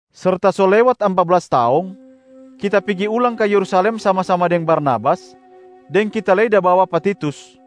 Serta so lewat ampa blas taong, kita pigi ulang ka Yerusalem sama-sama deng Barnabas, deng kita lei da bawa pa Titus.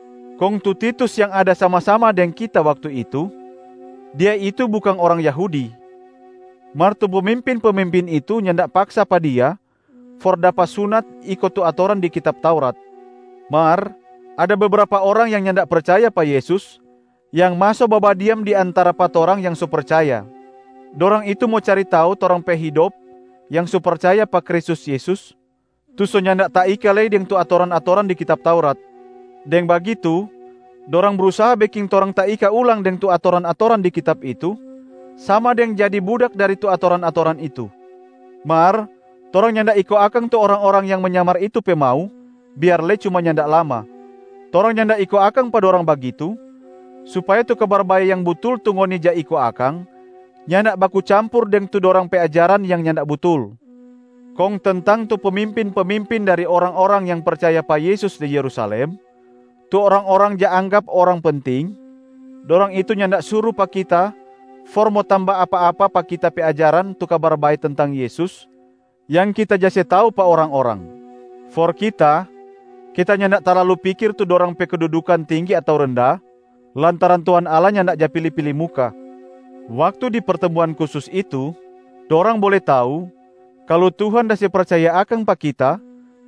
Kong tu Titus yang ada sama-sama deng kita waktu itu, dia itu bukang orang Yahudi, mar tu pemimpin-pemimpin itu nyanda paksa pa dia for dapa sunat iko tu atoran di kitab Taurat. Mar ada bebrapa orang yang nyanda percaya pa Yesus yang maso babadiam di antara pa torang yang so percaya. Dorang itu mo cari tau torang pe hidop yang so percaya pa Kristus Yesus tu so nyanda taika lei deng tu atoran-atoran di kitab Taurat. Deng bagitu dorang brusaha beking torang taika ulang deng tu atoran-atoran di kitab itu, sama deng jadi budak dari tu atoran-atoran itu. Mar torang nyanda iko akang tu orang-orang yang menyamar itu pe mau biar lei cuma nyanda lama. Torang nyanda iko akang pa dorang bagitu supaya tu Kabar Bae yang butul tu ngoni ja iko akang nyanda baku campur deng tu dorang pe ajaran yang nyanda butul. Kong tentang tu pemimpin-pemimpin dari orang-orang yang percaya pa Yesus di Yerusalem, tu orang-orang ja anggap orang penting, dorang itu nyanda suru pa kita for mo tamba apa-apa pa kita pe ajaran tu Kabar Bae tentang Yesus yang kita ja se tau pa orang-orang. (For kita, kita nyanda talalu pikir tu dorang pe kedudukan tinggi ato renda, lantaran Tuhan Allah nyanda ja pili-pili muka.) Waktu di pertemuan khusus itu, dorang bole tau kalu Tuhan da se percaya akang pa kita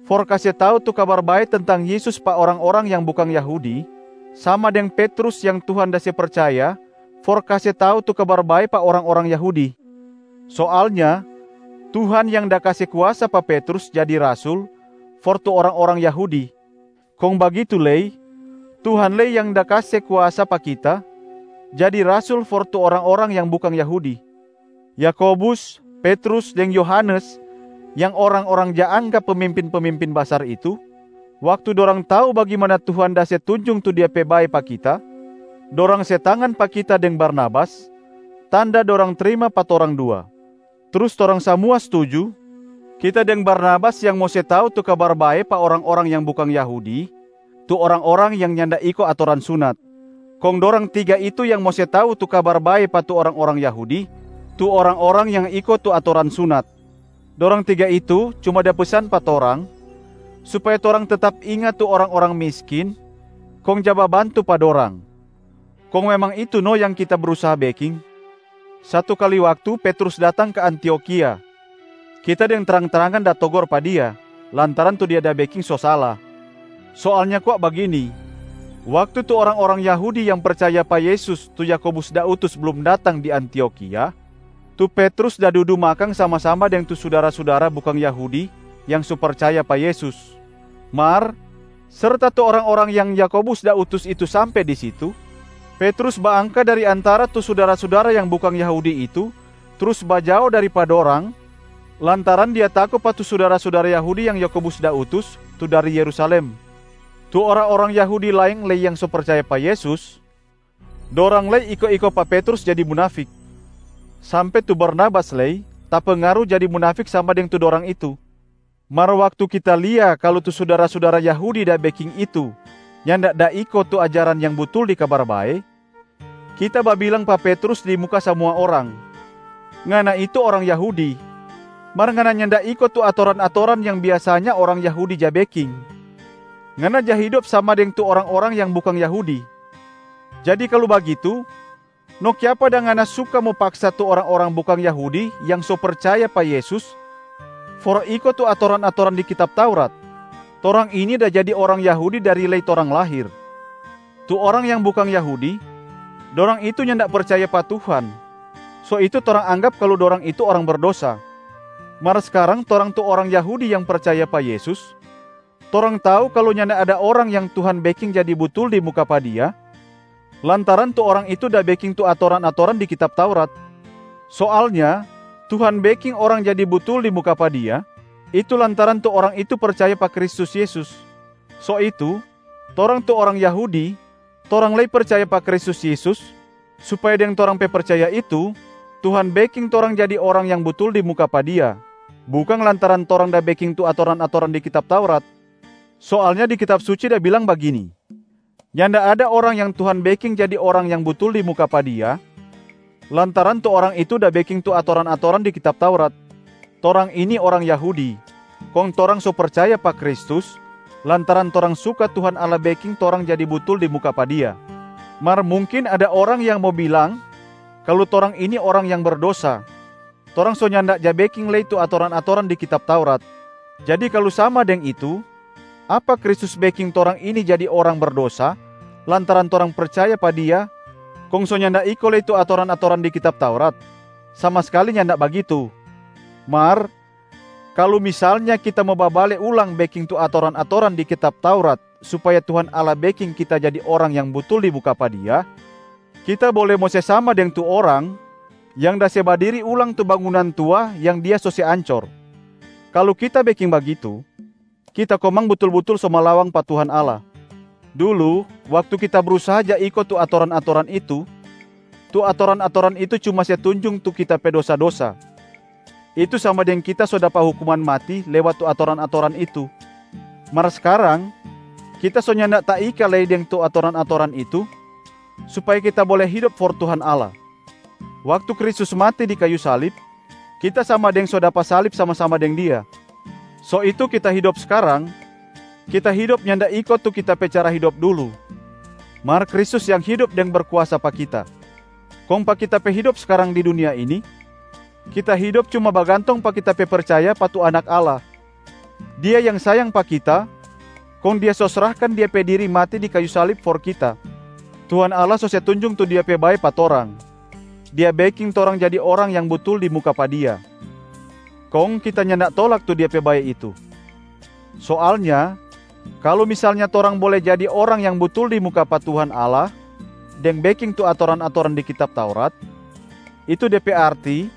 for kase tau tu Kabar Bae tentang Yesus pa orang-orang yang bukang Yahudi, sama deng Petrus yang Tuhan da se percaya for kase tau tu Kabar Bae pa orang-orang Yahudi. Soalnya Tuhan yang da kase kuasa pa Petrus jadi rasul for tu orang-orang Yahudi, kong bagitu lei Tuhan lei yang da kase kuasa pa kita jadi rasul for tu orang-orang yang bukang Yahudi. Yakobus, Petrus deng Yohanes yang orang-orang ja anggap pemimpin-pemimpin basar itu, waktu dorang tau bagimana Tuhan da se tunjung tu Dia pe bae pa kita, dorang se tangan pa kita deng Barnabas tanda dorang trima pa torang dua. Trus torang samua stuju kita deng Barnabas yang mo se tau tu Kabar Bae pa orang-orang yang bukang Yahudi, tu orang-orang yang nyanda iko atoran sunat, kong dorang tiga itu yang mo se tau tu Kabar Bae pa tu orang-orang Yahudi, tu orang-orang yang iko tu atoran sunat. Dorang tiga itu cuma da pesan pa torang, supaya torang tetap inga tu orang-orang miskin kong ja babantu pa dorang, kong memang itu no yang kita brusaha beking. Satu kali waktu Petrus datang ka Antiokhia, kita deng trang-trangan da togor pa dia, lantaran tu dia da beking so sala. Soalnya kwa bagini: waktu tu orang-orang Yahudi yang percaya pa Yesus tu Yakobus da utus blum datang di Antiokhia, tu Petrus da dudu makang sama-sama deng tu sudara-sudara bukang Yahudi yang so percaya pa Yesus. Mar serta tu orang-orang yang Yakobus da utus itu sampe di situ, Petrus baangka dari antara tu sudara-sudara yang bukang Yahudi itu trus bajao dari pa dorang lantaran dia tako pa tu sudara-sudara Yahudi yang Yakobus da utus tu dari Yerusalem. Tu orang-orang Yahudi laeng lei yang so percaya pa Yesus, dorang lei iko-iko pa Petrus jadi munafik, sampe tu Barnabas lei tapengaru jadi munafik sama deng tu dorang itu. Mar waktu kita lia kalu tu sudara-sudara Yahudi da beking itu nyanda da iko tu ajaran yang butul di Kabar Bae, kita babilang pa Petrus di muka samua orang, “Ngana itu orang Yahudi, mar ngana nyanda iko tu atoran-atoran yang biasanya orang Yahudi ja beking, ngana ja hidop sama deng tu orang-orang yang bukang Yahudi. Jadi kalu bagitu, no kiapa dang ngana suka mo paksa tu orang-orang bukang Yahudi yang so percaya pa Yesus for iko tu atoran-atoran di kitab Taurat?” Torang ini da jadi orang Yahudi dari lei torang lahir. Tu orang yang bukang Yahudi, dorang itu nyanda percaya pa Tuhan, so itu torang anggap kalu dorang itu orang berdosa. Mar skarang torang tu orang Yahudi yang percaya pa Yesus, torang tau kalu nyanda ada orang yang Tuhan beking jadi butul di muka pa Dia lantaran tu orang itu da beking tu atoran-atoran di kitab Taurat. Soalnya Tuhan beking orang jadi butul di muka pa Dia, itu lantaran tu orang itu percaya pa Kristus Yesus. So itu, torang tu orang Yahudi, torang lei percaya pa Kristus Yesus supaya deng torang pe percaya itu, Tuhan beking torang jadi orang yang butul di muka pa Dia, bukang lantaran torang da beking tu atoran-atoran di kitab Taurat. Soalnya di Kitab Suci da bilang bagini, “Nyanda ada orang yang Tuhan beking jadi orang yang butul di muka pa Dia lantaran tu orang itu da beking tu atoran-atoran di kitab Taurat.” Torang ini orang Yahudi, kong torang so percaya pa Kristus lantaran torang suka Tuhan Allah beking torang jadi butul di muka pa Dia. Mar mungkin ada orang yang mo bilang kalu torang ini orang yang berdosa, torang so nyanda ja beking lei tu atoran-atoran di kitab Taurat. Jadi kalu sama deng itu, apa Kristus beking torang ini jadi orang berdosa lantaran torang percaya pa Dia kong so nyanda iko lei tu atoran-atoran di kitab Taurat? Sama skali nyanda bagitu! Mar kalu misalnya kita mo babale ulang beking tu atoran-atoran di kitab Taurat supaya Tuhan Allah beking kita jadi orang yang butul di muka pa Dia, kita bole mo se sama deng tu orang yang da se badiri ulang tu bangunan tua yang dia so se ancor. Kalu kita beking bagitu, kita komang butul-butul so malawang pa Tuhan Allah. Dulu waktu kita brusaha ja iko tu atoran-atoran itu, tu atoran-atoran itu cuma se tunjung tu kita pe dosa-dosa, itu sama deng kita so dapa hukuman mati lewat tu atoran-atoran itu. Mar skarang kita so nyanda taika lei deng tu atoran-atoran itu supaya kita bole hidop for Tuhan Allah. Waktu Kristus mati di kayu salib, kita sama deng so dapa salib sama-sama deng Dia. So itu kita hidop skarang, kita hidop nyanda iko tu kita pe cara hidop dulu, mar Kristus yang hidop deng berkuasa pa kita. Kong pa kita pe hidop skarang di dunia ini, kita hidop cuma bagantong pa kita pe percaya pa tu Anak Allah. Dia yang sayang pa kita, kong Dia so srahkan Dia pe diri mati di kayu salib for kita. Tuhan Allah so se tunjung tu Dia pe bae pa torang, Dia beking torang jadi orang yang butul di muka pa Dia, kong kita nyanda tolak tu Dia pe bae itu. Soalnya kalu misalnya torang bole jadi orang yang butul di muka pa Tuhan Allah deng beking tu atoran-atoran di kitab Taurat, itu de pe arti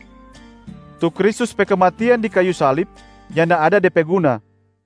tu Kristus pe kematian di kayu salib nyanda ada de pe guna.